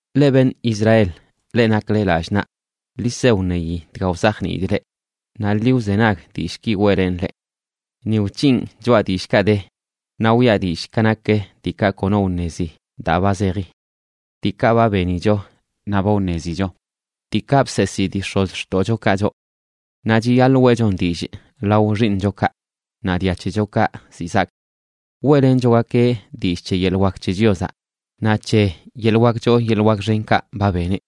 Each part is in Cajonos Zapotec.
Leꞌ beṉꞌ Israel, leꞌ nakle lallꞌ naꞌ, ḻi se wṉeyi dga wzajniidꞌ leꞌ; naꞌ ḻi wzenag dillꞌki weꞌlenꞌ leꞌ. Ni wc̱hinꞌ choꞌa dillꞌkaꞌ de, naꞌ wiꞌa dillꞌ ka nak diikaꞌ kono wṉezi daa ba zeji. diikaꞌ ba benicho naꞌ ba wṉezicho, diikaꞌ bseesii dii x̱ozxtoꞌchokaꞌ choꞌ. Naꞌ chiyaḻꞌ weꞌchon dillꞌ lao xiiṉchokaꞌ, naꞌ dia c̱hechokaꞌ ziꞌ zaak. Weꞌlenchogakeꞌ dillꞌ c̱he yeḻꞌ wak c̱he Chiozaꞌ, naꞌ c̱he yeḻꞌ wak choo yeḻꞌ wak xenkaꞌ ba beneꞌ.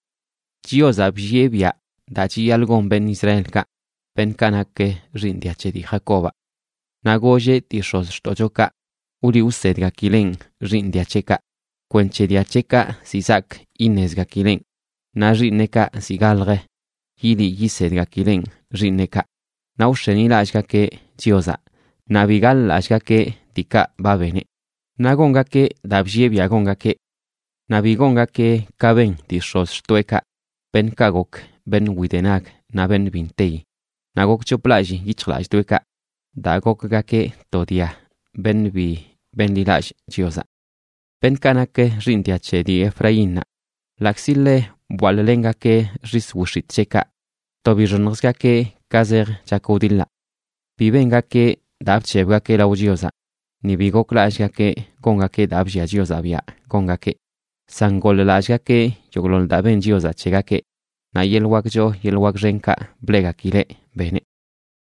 Chiozaꞌ bllieꞌ biaꞌ daa chiyaḻꞌ gon beṉꞌ Israelkaꞌ beṉꞌkaꞌ nak xiiṉ dia c̱he dii Jacobaꞌ; Naꞌ golleꞌ dii x̱ozxtoꞌchokaꞌ wliꞌ wsedgakileꞌn xiiṉ dia c̱heꞌkaꞌ, kwenc̱he dia c̱heꞌkaꞌ ziꞌ zaak iṉezgakileꞌn naꞌ xiiṉeꞌkaꞌ ziꞌ galj yiliꞌ yisedgakileꞌn xiiṉeꞌkaꞌ, naꞌ wx̱enilallꞌgakeꞌ Chiozaꞌ, naꞌ bi gaḻ-lallꞌgakeꞌ diikaꞌ ba beneꞌ; naꞌ gongakeꞌ daa bllieꞌ biaꞌ gongakeꞌ. Naꞌ bi gongakeꞌ ka ben dii x̱ozxtoꞌekaꞌ, beṉꞌkaꞌ gok beṉꞌ widenag naꞌ beṉꞌ bi nteyi; naꞌ gokc̱hoplallii yic̱hjlalldoeꞌkaꞌ daa gokgakeꞌ to dia beṉꞌ bi benḻilallꞌ Chiozaꞌ. Beṉꞌkaꞌ nak xiiṉ dia c̱he dii Efraínnaꞌ ḻaꞌkzi ḻe bwaḻꞌlengakeꞌ xis wix̱itꞌ c̱heꞌkaꞌ, to bixoṉjzgakeꞌ ka zej chak wdiḻaꞌ. Bi bengakeꞌ daa bc̱hebgakeꞌ lao Chiozaꞌ ni bi goklallꞌgakeꞌ gongakeꞌ daa bllia Chiozaꞌ biaꞌ gongakeꞌ; san goḻ-lallꞌgakeꞌ yogꞌḻoḻ daa ben Chiozaꞌ c̱hegakeꞌ naꞌ yeḻꞌ wak choo yeḻꞌ wak xenkaꞌ bleꞌgakileꞌ beneꞌ.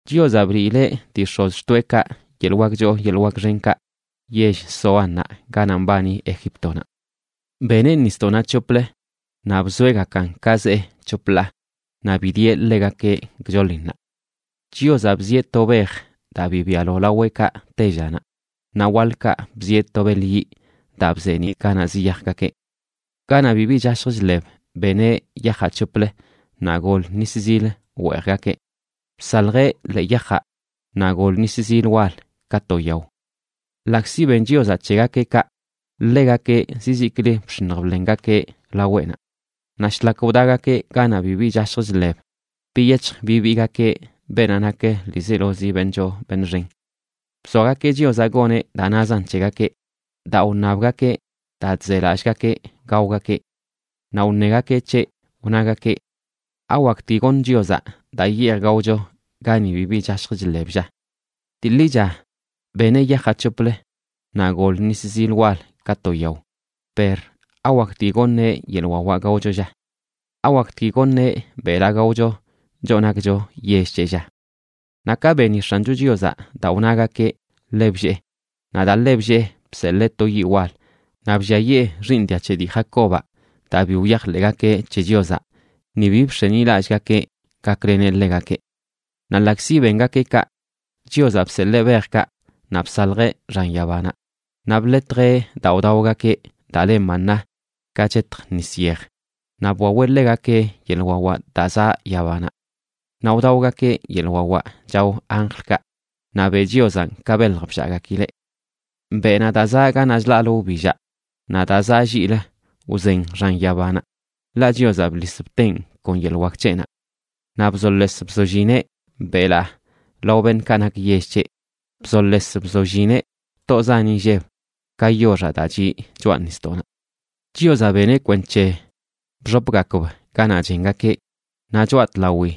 Chiozaꞌ bliileꞌ dii x̱ozxtoeꞌkaꞌ yeḻꞌ wak choo yeḻꞌ wak xenkaꞌ yell Zoánnaꞌ ganaꞌ mbani Egíptonaꞌ. Beneꞌ nisdoꞌnaꞌ c̱hoplə, naꞌ bzoeꞌgakan ka zee c̱hop ḻaa, naꞌ bidieꞌ ḻegakeꞌ gchoḻinnaꞌ. Chiozaꞌ bzieꞌ to bej daa bibialo laweꞌkaꞌ tellanaꞌ, naꞌ waḻkaꞌ bzieꞌ to beḻ yiꞌ daa bzeeniꞌ ganaꞌ ziyajgakeꞌ. Ganaꞌ bibi chashj chḻeb beneꞌ yajaꞌ c̱hoplə naꞌ gol nis zil weejgakeꞌ; bsaljeꞌ ḻee yajaꞌ naꞌ gol nis zil wal ka to yao. Ḻaꞌkzi ben Chiozaꞌ c̱hegakeꞌ kaꞌ, ḻegakeꞌ zizikli bx̱iṉj bḻengakeꞌ laweꞌnaꞌ; naꞌ shlak wdagakeꞌ ganaꞌ bibi chashj chḻeb, biyec̱hj bibiigakeꞌ beenaꞌ nak ḻiizelozi beṉꞌ choo beṉꞌ xen. Bzoagakeꞌ Chiozaꞌ goneꞌ daa nazan c̱hegakeꞌ daa wṉabgakeꞌ daa chzelallꞌgakeꞌ gaogakeꞌ. Naꞌ wṉegakeꞌ c̱heꞌ, wnagakeꞌ: “¿Awaktgui goṉ Chiozaꞌ daa yej gaocho gani bibi chashj chḻeb, lla? Dii ḻicha beneꞌ yajaꞌ c̱hoplə; naꞌ gol nis zil wal ka to yao, per ¿awaktgui goṉeꞌ yeḻꞌ wawaꞌ gaocho, lla? ¿Awaktgui goṉeꞌ belaa gaocho choꞌ nakcho yell c̱heꞌ, lla?” Naꞌ ka beni X̱ancho Chiozaꞌ daa wnagakeꞌ ḻe bllee. Naꞌ daa ḻe bllee bseḻee to yiꞌ wal naꞌ blliayee xiiṉ dia c̱he dii Jacobaꞌ, daa bi wyajḻeꞌgakeꞌ c̱he Chiozaꞌ ni bi bx̱enilallꞌgakeꞌ gakleneꞌ ḻegakeꞌ. Naꞌ ḻaꞌkzi bengakeꞌ kaꞌ, Chiozaꞌ bseḻee bejkaꞌ naꞌ bsaljeꞌ xan yabanaꞌ; naꞌ bḻetjeꞌ daa wdaogakeꞌ daa le maná ka chetj nis yej, naꞌ bwaweꞌ ḻegakeꞌ yeḻꞌ wawaꞌ daa zaꞌ yabanaꞌ. Naꞌ wdaogakeꞌ yeḻꞌ wawaꞌ chao anjlkaꞌ; naꞌ beꞌ Chiozanꞌ ka belj bllaꞌgakileꞌ. Beꞌnaꞌ da zaꞌ ganaꞌ chlaꞌlə wbillaꞌ naꞌ daa zaꞌ lliꞌlə wzen xan yabanaꞌ; ḻaꞌ Chiozaꞌ bḻis bteꞌn kon yeḻꞌ wak c̱heꞌnaꞌ. Naꞌ bzoles bzollineꞌ belaa lao beṉꞌkaꞌ nak yell c̱heꞌ; bzoles bzollineꞌ btoꞌ zan inlleb ka yoxaꞌ daa chiꞌ choꞌa nisdoꞌnaꞌ. Chiozaꞌ beneꞌ kwenc̱he bxopgakb ganaꞌ chengakeꞌ, naꞌ choꞌa tlawi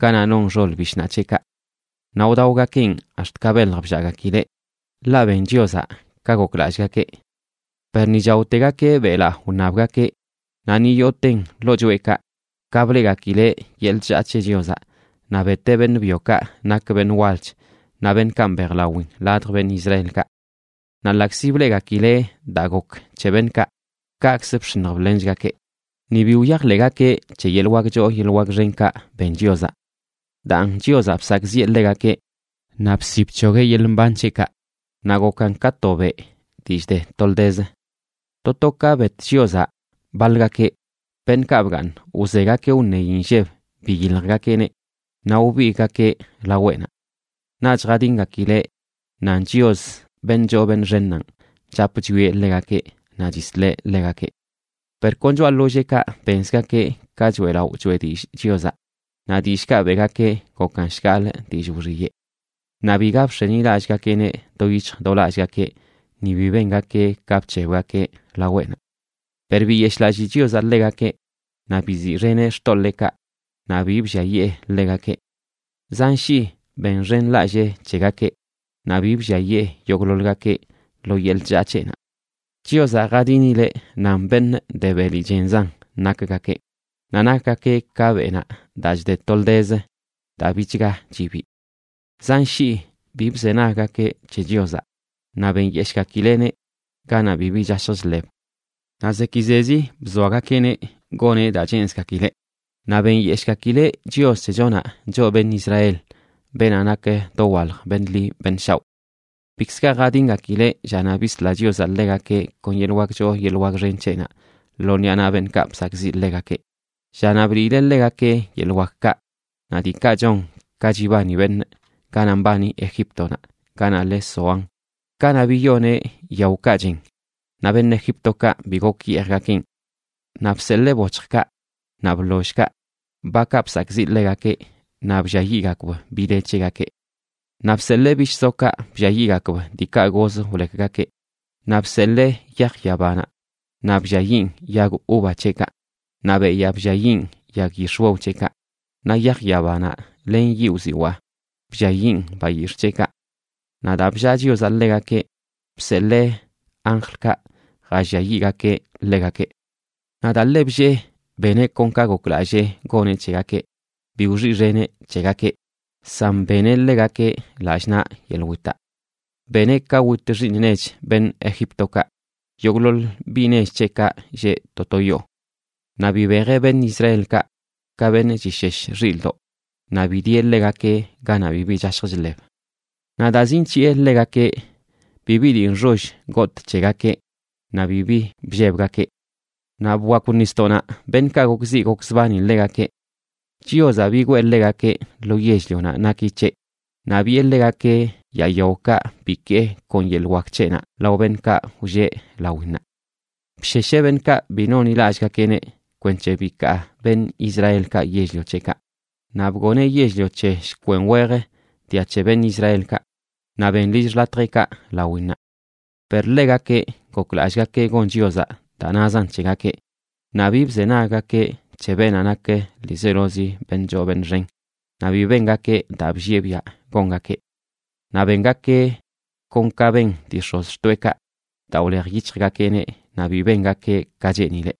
ganaꞌ non xol bishnaꞌ c̱heꞌkaꞌ. Naꞌ wdaogakeꞌn ax̱t ka belj bllaꞌgakileꞌ, ḻaꞌ ben Chiozaꞌ ka goklallꞌgakeꞌ. Per ni chaotegakeꞌ belaa wṉabgakeꞌ naꞌ ni yooten ḻoo choꞌekaꞌ, ka bleꞌgakileꞌ yeḻꞌ chllaa c̱he Chiozaꞌ, naꞌ beteꞌ beṉꞌ byokaꞌ nak beṉꞌ walch naꞌ beṉꞌkaꞌ mbejlawin ladj beṉꞌ Israelkaꞌ. Naꞌ ḻaꞌkzi bleꞌgakileꞌ daa gok c̱he beṉꞌkaꞌ, kaꞌkz bx̱iṉj bḻenchgakeꞌ, ni bi wyajḻeꞌgakeꞌ c̱he yeḻꞌ wak choo yeḻꞌ wak xenkaꞌ ben Chiozaꞌ. Daan Chiozaꞌ bsakꞌziꞌe ḻegakeꞌ naꞌ bsi bc̱hogueꞌ yeḻꞌ mban c̱heꞌkaꞌ naꞌ gokan ka to beꞌ dii chde toldez. To to ka bet Chiozaꞌ baḻgakeꞌ, beṉꞌkaꞌ bgaaṉ wzegakeꞌ wṉeyi nlleb biyiljgakeꞌneꞌ, naꞌ wbigꞌgakeꞌ laweꞌnaꞌ. Naꞌch jadingakileꞌ nan Chios, beṉꞌ choo beṉꞌ xennanꞌ, chap chwieꞌ ḻegakeꞌ naꞌ chisleꞌ ḻegakeꞌ. Per kon choꞌa ḻolleekaꞌ benzgakeꞌ ka choeꞌlaꞌo choꞌe dillꞌ Chiozaꞌ, naꞌ dillꞌkaꞌ beꞌgakeꞌ gokan shgaḻꞌ dillꞌ wxiyeꞌ. Naꞌ biga bx̱enilallꞌgakeꞌneꞌ do yic̱hj do lallgakeꞌ, ni bi bengakeꞌ ka bc̱hebgakeꞌ laweꞌnaꞌ. Per biyeshꞌlallii Chiozaꞌ ḻegakeꞌ, naꞌ biziꞌxeneꞌ xtoḻeekaꞌ naꞌ bi blliayee ḻegakeꞌ. Zan shii benxenlallee c̱hegakeꞌ naꞌ bi blliayee yogꞌḻoḻgakeꞌ lo yeḻꞌ chllaa c̱heꞌnaꞌ. Chiozaꞌ jadinileꞌ nan beṉꞌ de beli chenzan nakgakeꞌ; naꞌ nakgakeꞌ ka beꞌnaꞌ daa chde toldez daa bichga chibii. Zan shii bi bzenaggakeꞌ c̱he Chiozaꞌ, naꞌ benyeshꞌgakileꞌneꞌ ganaꞌ bibi chashj chḻeb. Naꞌ zekizezi bzoagakeꞌneꞌ goneꞌ daa cheenzgakileꞌ, naꞌ benyeshꞌgakileꞌ Chios c̱hechonaꞌ, choꞌ beṉꞌ Israel, beenaꞌ nak dowalj beṉꞌ ḻi beṉꞌ shaoꞌ. Bikz ga jadingakileꞌ llanaꞌ bisla Chiozaꞌ ḻegakeꞌ kon yeḻꞌ wak choo yeḻꞌ wak xen c̱heꞌnaꞌ lo ṉiꞌa naꞌ beṉꞌkaꞌ bsakꞌziꞌ ḻegakeꞌ, llanaꞌ bliileꞌ ḻegakeꞌ yeḻꞌ wakkaꞌ naꞌ diikaꞌ chon ka chibani beṉꞌ, ganaꞌ mbani Egíptonaꞌ, ganaꞌ le Zoán, kanaꞌ biyoneꞌ yaokaꞌ chen, naꞌ beṉꞌ Egíptokaꞌ bi gok yeejgakeꞌn. Naꞌ bseḻee boc̱hjkaꞌ naꞌ bḻollkaꞌ bakaꞌ bsakꞌziꞌ ḻegakeꞌ naꞌ blliayiꞌgakb bi de c̱hegakeꞌ. Naꞌ bseḻee bishꞌ zokaꞌ blliayiꞌgakb diikaꞌ goz wlekgakeꞌ. Naꞌ bseḻee yaj yabanaꞌ naꞌ blliayiꞌn yag uva c̱heꞌkaꞌ naꞌ beyaa blliayiꞌn yag yix̱wew c̱heꞌkaꞌ, naꞌ yaj yabanaꞌ len yiꞌ wziwaa blliayiꞌn bayix̱ꞌ c̱heꞌkaꞌ. Naꞌ daa bllaa Chiozaꞌ ḻegakeꞌ, bseḻee anjlkaꞌ jalliayiꞌgakeꞌ ḻegakeꞌ. Naꞌ daa ḻe bllee, beneꞌ kon ka goklallee goneꞌ c̱hegakeꞌ. Bi wxiꞌxeneꞌ c̱hegakeꞌ, san beneꞌ ḻegakeꞌ lallꞌ naꞌ yeḻꞌ witaꞌ. Beneꞌ ka wit xiiṉ nech beṉꞌ Egíptokaꞌ, yogꞌḻoḻ biꞌ nech c̱heꞌkaꞌ lleꞌ to to yoo. Naꞌ bibejeꞌ beṉꞌ Israelkaꞌ ka beṉꞌ chishesh xilꞌdoꞌ, naꞌ bidieꞌ ḻegakeꞌ ganaꞌ bibi chashj chḻeb. Naꞌ daa zinc̱hiꞌe ḻegakeꞌ, bibi dii nxoll gotꞌ c̱hegakeꞌ, naꞌ bibi bllebgakeꞌ; naꞌ bwakw nisdoꞌnaꞌ beṉꞌkaꞌ gokziꞌ gokzbani ḻegakeꞌ. Chiozaꞌ bigwee ḻegakeꞌ lo yell-lionaꞌ naki c̱heꞌ, naꞌ biꞌe ḻegakeꞌ yaa yaokaꞌ bikee kon yeḻꞌ wak c̱heꞌnaꞌ lao beṉꞌkaꞌ wlleꞌ lawinnaꞌ. Bshesheꞌ beṉꞌkaꞌ bi nonḻilallꞌgakeꞌneꞌ kwenc̱he bikaa beṉꞌ Israelkaꞌ yell-lio c̱heꞌkaꞌ. Naꞌ bgoneꞌ yell-lio c̱he shkwen wej dia che beṉꞌ Israelkaꞌ naꞌ ben lill xḻatjeꞌkaꞌ lawinnaꞌ. Per ḻegakeꞌ goklallꞌgakeꞌ gon Chiozaꞌ daa nazan c̱hegakeꞌ, naꞌ bi bzenaggakeꞌ c̱he beenaꞌ nak ḻiizelozi beṉꞌ choo beṉꞌ xen, naꞌ bi bengakeꞌ daa bllieꞌ biaꞌ gongakeꞌ. Naꞌ bengakeꞌ kon ka ben dii x̱ozxtoeꞌkaꞌ daa wlejyic̱hjgakeꞌneꞌ naꞌ bi bengakeꞌ ka cheenileꞌ.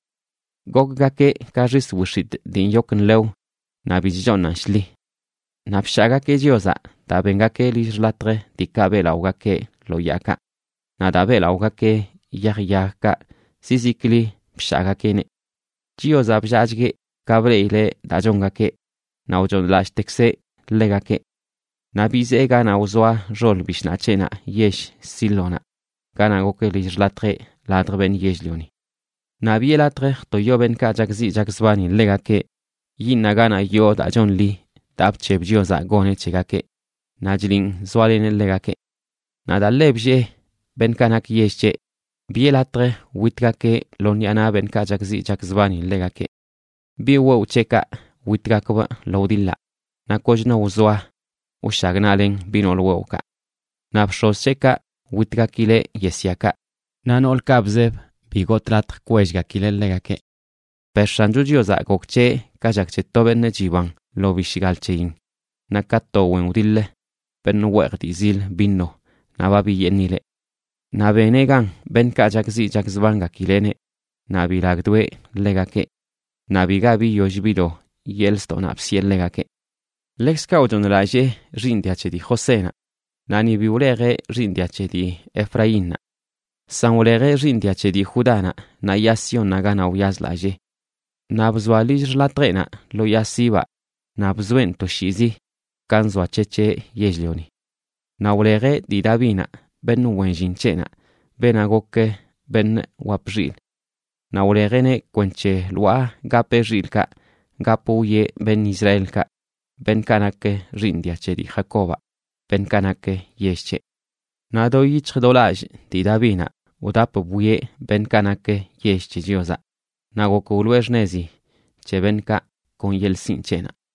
Gokgakeꞌ ka xis wix̱itꞌ dii nyok nḻew naꞌ bi chchooṉan shḻi. Naꞌ bshaagakeꞌ Chiozaꞌ daa bengakeꞌ lill xḻatj diikaꞌ beꞌlaꞌogakeꞌ lo yaakaꞌ; naꞌ daa beꞌlaꞌogakeꞌ yaj yagkaꞌ, zizikli bshaagakeꞌneꞌ. Chiozaꞌ bllaachgueꞌ ka bleꞌile daa chongakeꞌ, naꞌ wchooṉlallꞌtekzeꞌ ḻegakeꞌ. Naꞌ bizee ganaꞌ wzoa xol bishnaꞌ c̱heꞌnaꞌ yell Sílonaꞌ ganaꞌ gok lill xḻatjeꞌ ladj beṉꞌ yell-lioni. Naꞌ biꞌe latj jtoyo beṉꞌkaꞌ chakziꞌ chakzbani ḻegakeꞌ yiiṉaꞌ ganaꞌ yoo daa chonḻi daa bc̱heb Chiozaꞌ goneꞌ c̱hegakeꞌ naꞌ chliꞌn zoaleneꞌ ḻegakeꞌ. Naꞌ daa ḻe bllee beṉꞌkaꞌ nak yell c̱heꞌ, biꞌe latj witgakeꞌ lo ṉiꞌa naꞌ beṉꞌkaꞌ chakziꞌ chakzbani ḻegakeꞌ. Biꞌ wewꞌ c̱heꞌkaꞌ witgakbꞌ lo wdiḻaꞌ; ¡naꞌ kochno wzoa wshagnaꞌlen biꞌ nool wewꞌkaꞌ! Naꞌ bx̱oz c̱heꞌkaꞌ witgakileꞌ yesyakaꞌ, naꞌ noolkaꞌ bzeb, bi gotꞌ latj kwellgakileꞌ ḻegakeꞌ. Per X̱ancho Chiozaꞌ gok c̱heꞌ ka chak c̱he to beṉꞌ chiban lo bishgal c̱heyin, naꞌ ka to wen wdiḻ beṉꞌ weej dii zil vino naꞌ ba biyeeṉileꞌ. Naꞌ beneꞌ gan beṉꞌkaꞌ chakziꞌ chakzbangakileꞌneꞌ naꞌ bilagdoeꞌ ḻegakeꞌ. Naꞌ biga biyoll bido yeḻꞌ ztoꞌnaꞌ bsiꞌe ḻegakeꞌ. Ḻekzkaꞌ wchooṉlallee xiiṉ dia c̱he dii Josénaꞌ, naꞌ ni bi wlejeꞌ xiiṉ dia c̱he dii Efraínnaꞌ. San wleje xiiṉ dia c̱he dii Judánaꞌ naꞌ Yaa Siónnaꞌ ganaꞌ wyazlallee. Naꞌ bzoa lill xḻatjeꞌnaꞌ lo yaa sibaꞌ, naꞌ bzoeꞌn toshiizi, ka nzoac̱hec̱heꞌ yell-lioni. Naꞌ wlejeꞌ dii Davinaꞌ, beṉꞌ wen llin c̱heꞌnaꞌ, beenaꞌ gok beṉꞌ wap xilꞌ. Naꞌ wlejeꞌneꞌ kwenc̱he lwaa gapeꞌ xilꞌkaꞌ, gap wwieꞌ beṉꞌ Israelkaꞌ, beṉꞌkaꞌ nak xiiṉ dia c̱he dii Jacobaꞌ, beṉꞌkaꞌ nak yell c̱heꞌ. Naꞌ do yic̱hj do lallꞌ dii Davinaꞌ wdap bwieꞌ beṉꞌkaꞌ nak yell c̱he Chiozaꞌ, naꞌ gok wloꞌe xṉezi c̱he beṉꞌkaꞌ kon yeḻꞌ sinꞌ c̱heꞌnaꞌ.